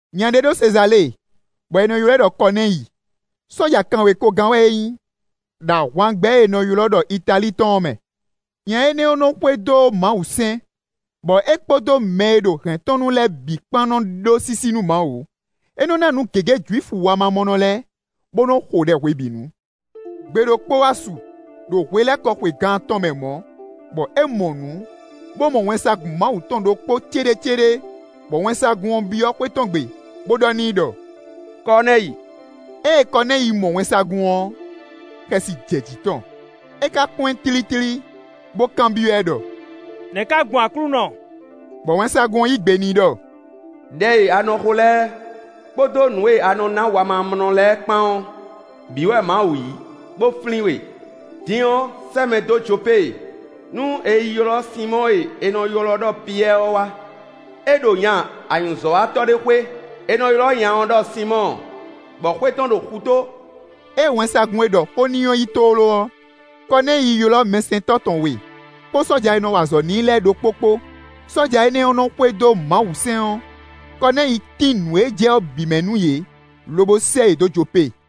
Nya ɖé ɖo Sezalée, bɔ è nɔ ylɔ́ ɛ ɖɔ Kɔnɛ́yi; sɔ́ja kanwekogán wɛ é nyí, ɖo ahwangbɛ́ e è nɔ ylɔ́ ɖɔ Italíi tɔn ɔ́ mɛ. Nya énɛ́ ɔ́ nɔ́ xwedó Mawusɛ́n, bɔ é kpódó mɛ e ɖo hɛ̌n tɔn nu lɛ́ɛ bǐ kpán nɔ́ ɖó sísí nú Mawu. É nɔ́ ná nǔ gěgé Jwifu wamamɔnɔ lɛ́ɛ, bó nɔ́ xo ɖɛ hwebǐnu. Gbe ɖokpó wá su, ɖo hwelɛ́kɔ xwe gan atɔn mɛ mɔ̌, bɔ é mɔ nǔ, bó mɔ wɛnsagun Mawu tɔn ɖokpó céɖécéɖé, bɔ wɛnsagun ɔ́ byɔ́ xwé tɔn gbe, bó ɖɔ n'i ɖɔ: “Kɔnɛ́yi.” Ée Kɔnɛ́yi mɔ wɛnsagun ɔ́, xɛsi jɛ jǐ tɔn; é ká kpɔ́n ɛ tlítlí, bó kanbyɔ́ ɛ ɖɔ: “Nɛ̌ ká gbɔn Aklúnɔ?” Bɔ wɛnsagun ɔ́ yí gbe n'i ɖɔ: “Đɛ e a nɔ xo lɛ́ɛ, kpódó nǔ e a nɔ ná wamamɔnɔ lɛ́ɛ kpán ɔ́, bǐ wɛ Mawu yí, bó flín we. Din ɔ́, sɛ́ mɛ dó Jopée, nú è yi ylɔ́ Sinmɔ́ɔ e è nɔ ylɔ́ ɖɔ Piyɛ́ɛ ɔ́ wá. É ɖo nya anyǔzɔ́watɔ́ ɖé xwé; è nɔ ylɔ́ nya ɔ́ ɖɔ Sinmɔ́ɔ, bɔ xwé tɔn ɖo xutó.” Ée wɛnsagun e ɖɔ xó n'i ɔ́ yi tlóló ɔ́, Kɔnɛ́yi ylɔ́ mɛsɛntɔ́ tɔn we, kpó sɔ́ja e nɔ wa azɔ̌ n'i lɛ́ɛ ɖokpó kpó; sɔ́ja énɛ́ nɔ́ xwedó Mawusɛ́n ɔ́; Kɔnɛ́yi tín nǔ e jɛ ɔ́ bǐ mɛ nú yě, lobo sɛ́ yě dó Jopée.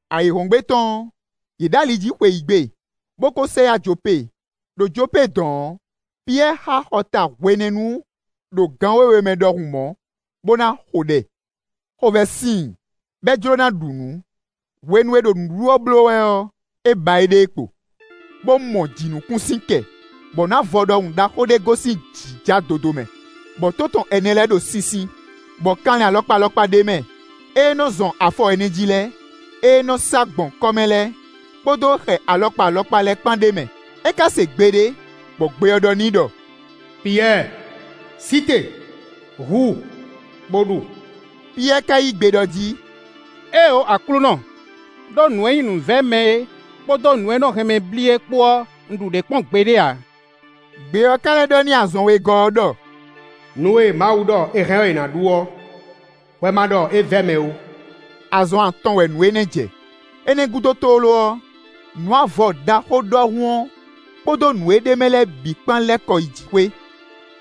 Ayǐhɔ́ngbe tɔn ɔ́, yě ɖo ali jí xweyǐgbe, bó kó sɛ yá Jopée. Đo Jopée dɔ̌n ɔ́, Piyɛ́ɛ xá xɔ ta hwenɛ́nu ɖo gan wěwe mɛ ɖɔhun mɔ̌, bó ná xo ɖɛ. Xovɛ́ sin i, bɔ é jló ná ɖu nǔ. Hwenu e è ɖo nǔɖuɖu ɔ́ bló wɛ ɔ́, é ba éɖée kpo, bó mɔ jǐnukúnsin kɛ, bɔ nǔ avɔ ɖaxó ɖɔhun ɖé gosín jǐ ja dodomɛ, bɔ tó tɔn ɛnɛ lɛ́ɛ ɖo sinsin; bɔ kanlin alɔkpa alɔkpa ɖ'é mɛ: ée nɔ́ zɔn afɔ ɛnɛ jí lɛ́ɛ, ée nɔ́ sá gbɔn kɔ́ mɛ lɛ́ɛ, kpódó xɛ alɔkpa alɔkpa lɛ́ɛ kpán ɖ'é mɛ. É ká se gbe ɖé, bɔ gbe ɔ́ ɖɔ n'i ɖɔ: “Piyɛ́ɛ! Sí te, hu, bó ɖu.” Piyɛ́ɛ ka yí gbe ɖɔ jí: “Éeǒ Aklúnɔ; ɖó nǔ e nyí nǔvɛ́mɛ é kpódó nǔ e nɔ hɛn mɛ blí é kpó ɔ́, un ɖu ɖě kpɔ́n gbeɖé ǎ.” Gbe ɔ́ ká lɛ́ ɖɔ n'i azɔn wegɔ́ ɔ́ ɖɔ: “Nǔ e Mawu ɖɔ è hɛn ɔ́, è nǎ ɖu ɔ́, hwɛ ma ɖɔ é vɛ́ mɛ ó.” Azɔn atɔn wɛ nǔ énɛ́ jɛ. Énɛ́ gúdo tlóló ɔ́, nǔ avɔ ɖaxó ɖɔhun ɔ́ kpódó nǔ e ɖ'é mɛ lɛ́ɛ bǐ kpán lɛ́ kɔ yi jǐxwé.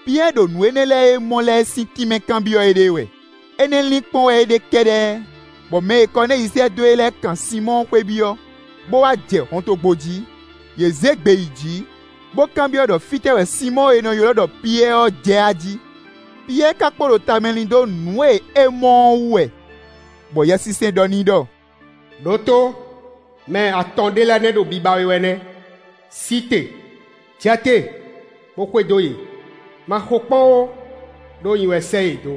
Piyɛ́ɛ ɖo nǔ énɛ́ lɛ́ɛ e é mɔ lɛ́ɛ sín tínmɛ kanbyɔ́ éɖée wɛ. Énɛ́ linkpɔ́n wɛ é ɖe kɛ́ɖɛ́, bɔ mɛ e Kɔnɛ́yi sɛ́ dó e lɛ́ɛ kan Sinmɔ́ɔ xwé byɔ́, bó wá jɛ hɔntogbó jí. Yě zé gbe yi jǐ, bó kanbyɔ́ ɖɔ fínɛ́ wɛ Sinmɔ́ɔ e è nɔ ylɔ́ ɖɔ Piyɛ́ɛ ɔ́ jɛ ají. Piyɛ́ɛ ka kpo ɖo tamɛ lin dó nǔ e é mɔ ɔ́ wú wɛ, bɔ Yɛsinsɛn ɖɔ n'i ɖɔ: “Đǒtó; mɛ atɔn ɖé lɛ́ɛ nɛ́ ɖo biba we wɛ nɛ́. Sí te, jɛ te, bó xwedó yě; ma xokpɔ́n ó, ɖó nyi wɛ sɛ́ yě dó.”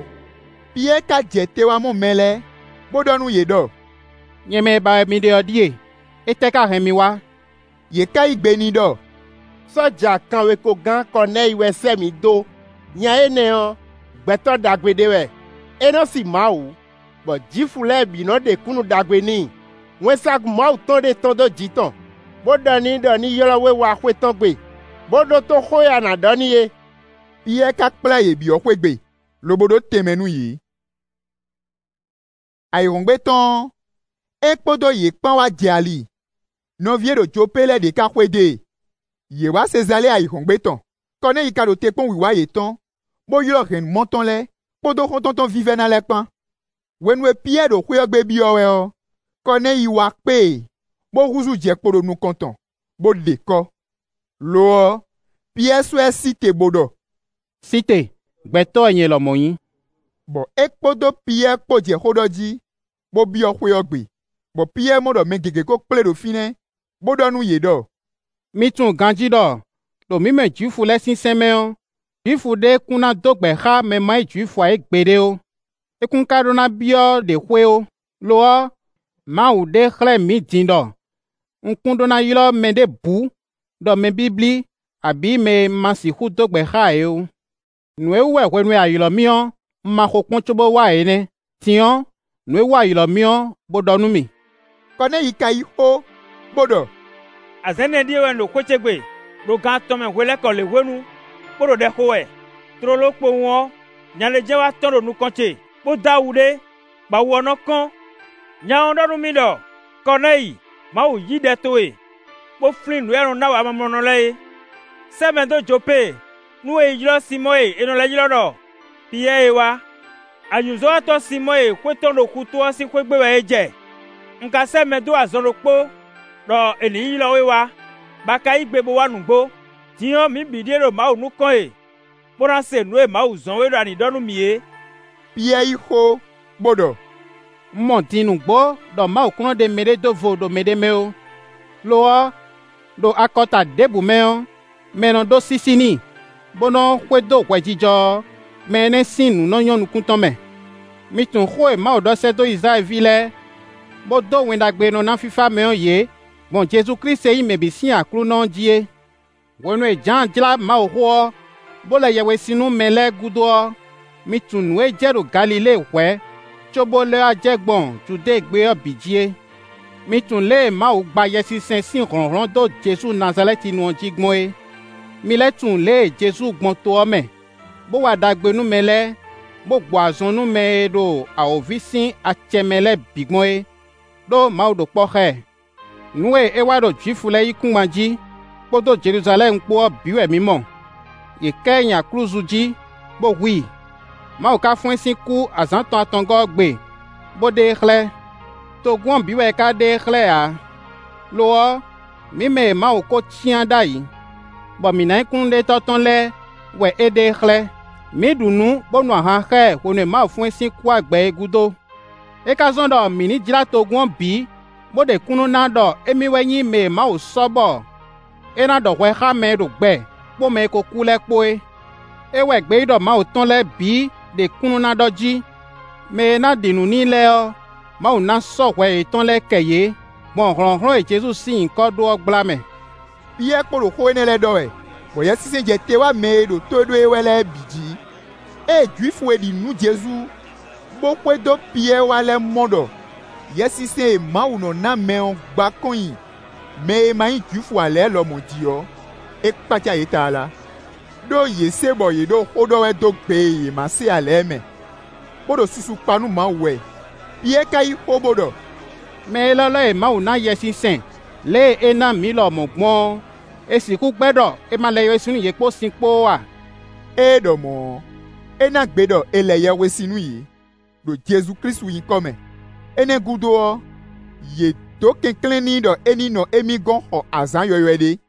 Piyɛ́ɛ ka jɛ te wá mɔ mɛ lɛ́ɛ, bó ɖɔ nú yě ɖɔ: “Nyɛ mɛ e ba wɛ mi ɖe ɔ́ ɖíe; étɛ́ ka hɛn mi wá?” Yě ka yí gbe n'i ɖɔ: “Sɔ́ja kanwekogán Kɔnɛ́yi wɛ sɛ́ mǐ dó; nya énɛ́ ɔ́, gbɛtɔ́ ɖagbe ɖé wɛ; é nɔ́ sí Mawu, bɔ Jwifu lɛ́ɛ bǐ nɔ́ ɖe kúnnu ɖagbe n'i. Wɛnsagun Mawu tɔn ɖé tɔ́n dó jǐ tɔn, bó ɖɔ n'i ɖɔ ní ylɔ́ we wá xwé tɔn gbe, bó ɖótó xó e a nǎ ɖɔ n'i é.” Piyɛ́ɛ ka kplá yě byɔ́ xwé gbe, lobo ɖó tɛnmɛ nú yě. Ayǐhɔ́ngbe tɔn ɔ́, é kpódó yě kpán wá jɛ ali; nɔví e ɖo Jopée lɛ́ɛ ɖě ka xwedó e. Yě wá Sezalée ayǐhɔ́ngbe tɔn. Kɔnɛ́yi ka ɖo te kpɔ́n wǐwá yětɔn, bó ylɔ́ hɛ̌nnumɔ tɔn lɛ́ɛ, kpódó xɔ́ntɔn tɔn vívɛ́ná lɛ́ɛ kpán. Hwenu e Piyɛ́ɛ ɖo xwé ɔ́ gbe byɔ́ wɛ ɔ́, Kɔnɛ́yi wá kpé e, bó húzú jɛ kpo ɖo nukɔn tɔn, bó ɖe kɔ́. Lo ɔ́, Piyɛ́ɛ sɔ́ ɛ sí te, bó ɖɔ: “Sí te, gbɛtɔ́ wɛ nyɛ lɔmɔ̌ nyí.” Bɔ é kpódó Piyɛ́ɛ kpó jɛ xó ɖɔ jí, bó byɔ́ xwé ɔ́ gbe, bɔ Piyɛ́ɛ mɔ ɖɔ mɛ gěgé kó kplé ɖo fínɛ́, bó ɖɔ nú yě ɖɔ: “Mi tunwun ganjí ɖɔ, ɖo mǐ mɛ Jwifu lɛ́ɛ sín sɛ́n mɛ ɔ́, Jwifu ɖé kún ɖó ná dó gbɛ̌ xá mɛ e ma nyí Jwifu ǎ é gbeɖé ó; é kún ka ɖó ná byɔ́ ɖě xwé ó. Lo ɔ́, Mawu ɖe xlɛ́ mǐ din ɖɔ un kún ɖó ná ylɔ́ mɛ ɖěbǔ ɖɔ mɛ blíblí abǐ mɛ e un ma sixú dó gbɛ̌ xá ǎ é ó. Nǔ e wú wɛ hwenu e a ylɔ̌ mì ɔ́, un ma xokpɔ́n cóbó wá ǎ é nɛ́. Din ɔ́, nǔ e wú a ylɔ̌ mì ɔ́, bó ɖɔ nú mì.” Kɔnɛ́yi ka yí xó, bó ɖɔ: “Azǎn ɛnɛ ɖíe wɛ un ɖo xwé ce gbe, ɖo gan atɔn mɛ hwelɛ́kɔ lěhwenu, bó ɖo ɖɛ xo wɛ; tlóló kpowun ɔ́, nya ɖé jɛ́n wá tɔ́n ɖo nukɔn ce, bó dó awu ɖé, bɔ awu ɔ́ nɔ́ kɔ́n. Nya ɔ́ ɖɔ nú mì ɖɔ: ‘Kɔnɛ́yi, Mawu yí ɖɛ towe, bó flín nǔ e a nɔ ná wamamɔnɔ lɛ́ɛ é. Sɛ́ mɛ dó Jopée, nú è yi ylɔ́ Sinmɔ́ɔ e è nɔ lɛ́ ylɔ́ ɖɔ Piyɛ́ɛ é wá. Anyǔzɔ́watɔ́ Sinmɔ́ɔ e xwé tɔn ɖo xutó ɔ́ sín xwé gbe wɛ é jɛ.’ Un ka sɛ́ mɛ dó azɔn ɖokpó, ɖɔ è nǐ yi ylɔ́ we wá, bɔ a ka yí gbe bo wá nǔgbó. Din ɔ́, mǐ bǐ ɖíe ɖo Mawu nukɔn e, bó ná se nǔ e Mawu zɔ́n we ɖɔ a nǐ ɖɔ nú mǐ é.” Piyɛ́ɛ yí xó, bó ɖɔ: “Un mɔ din nǔgbó ɖɔ Mawu kún nɔ́ ɖe mɛɖé ɖó vo ɖo mɛɖé mɛ ó. Lo ɔ́, ɖo akɔta ɖěbǔ mɛ ɔ́, mɛ e nɔ ɖó sísí n'i, bó nɔ́ xwedó hwɛjijɔ ɔ́, mɛ énɛ́ sín nǔ nɔ́ nyɔ́ nukún tɔn mɛ. Mi tunwun xó e Mawu ɖɔ sɛ́ dó Izlayɛ́li ví lɛ́ɛ, bó dó Wɛn Ɖagbe e nɔ ná fífá mɛ ɔ́ yě gbɔn Jezu Klísu e nyí mɛ bǐ sín Aklúnɔ ɔ́ jí é. Hwenu e Jǎan jlá Mawuxó ɔ́, bó lɛ yɛhwesin nú mɛ lɛ́ɛ gúdo ɔ́, mi tunwun nǔ e jɛ ɖo Galilée hwɛ̌ cóbó lɛ́ wá jɛ gbɔn Judée gbé ɔ́ bǐ jí é. Mi tunwun lě e Mawu gba Yɛsinsɛn sín hlɔ̌nhlɔ́n dó Jezu Nazalɛ́tinu ɔ́ jí gbɔn é; mi lɛ́ tunwun lě e Jezu gbɔn to ɔ́ mɛ, bó wa ɖagbe nú mɛ lɛ́ɛ, bó gbɔ azɔn nú mɛ e ɖo awǒvi sín acɛ mɛ lɛ́ɛ bǐ gbɔn é, ɖó Mawu ɖo kpɔ́ xá ɛ. Nǔ e é wa ɖo Jwifu lɛ́ɛ yíkúngban jí, kpódó Jeluzalɛ́mu kpó ɔ́ bǐ wɛ mǐ mɔ; yě ká ɛ nyi aklúzu jí, bó hu i. Mawu ka fɔ́n ɛ sín kú azǎn tɔn atɔngɔ́ ɔ́ gbe, bó ɖe e xlɛ́. Togun ɔ́ bǐ wɛ é ka ɖe e xlɛ́ ǎ; lo ɔ́, mǐ mɛ e Mawu kó cyán ɖ'ayǐ, bɔ mǐ ná nyí kúnnuɖetɔ́ tɔn lɛ́ɛ wɛ é ɖe e xlɛ́; mǐ ɖu nǔ, bó nu ahan xá ɛ hwenu e Mawu fɔ́n ɛ sín kú wá gbɛ é gúdo. É ka zɔ́n ɖɔ mǐ ní jlá togun ɔ́ bǐ, bó ɖe kúnnu ná ɖɔ émí wɛ nyí mɛ e Mawu sɔ́ bɔ é ná ɖɔ hwɛ xá mɛ e ɖo gbɛ kpó mɛ e ko kú lɛ́ɛ kpó é. É wɛ gbeyíɖɔ Mawu tɔn lɛ́ɛ bǐ ɖe kúnnu ná ɖɔ jí: ‘Mɛ e ná ɖi nǔ n'i lɛ́ɛ ɔ́, Mawu ná sɔ́ hwɛ yětɔn lɛ́ɛ kɛ yě, gbɔn hlɔ̌nhlɔ́n e Jezu sín nyǐkɔ ɖó ɔ́ gbla mɛ.’” Piyɛ́ɛ kpo ɖo xó énɛ́ lɛ́ɛ ɖɔ wɛ, bɔ Yɛsinsɛn jɛ te wá mɛ e ɖo tó ɖó e wɛ lɛ́ɛ bǐ jí. Ée Jwifu e ɖi nǔ nú Jezu, bó xwedó Piyɛ́ɛ wá lɛ́ɛ mɔ ɖɔ Yɛsinsɛn e Mawu nɔ́ ná mɛ ɔ́ gba kɔn nyi mɛ e ma nyí Jwifu ǎ lɛ́ɛ lɔmɔ̌ jí ɔ́, é kpácá yě tlala. Đó yě se bɔ yě ɖo xó ɖɔ wɛ dó gbe e yě ma se ǎ lɛ́ɛ mɛ, bó ɖo susu kpa nú Mawu wɛ. Piyɛ́ɛ ka yí xó, bó ɖɔ: “Mɛ élɔ́ lɛ́ɛ e Mawu ná Yɛsinsɛn lě e é ná mǐ lɔmɔ̌ gbɔn ɔ́, è sixú gbɛ́ ɖɔ è ma lɛ yɛhwesin nú yě kpó sin kpó ó a?” Ée é ɖɔ mɔ̌ ɔ́, é ná gbe ɖɔ è lɛ yɛhwesin nú yě, ɖo Jezu Klísu nyǐkɔ mɛ. Énɛ́ ɔ́ gúdo ɔ́, yě dó kɛnklɛ́n n'i ɖɔ é ní nɔ émí gɔ́n xɔ azǎn yɔywɛ ɖé.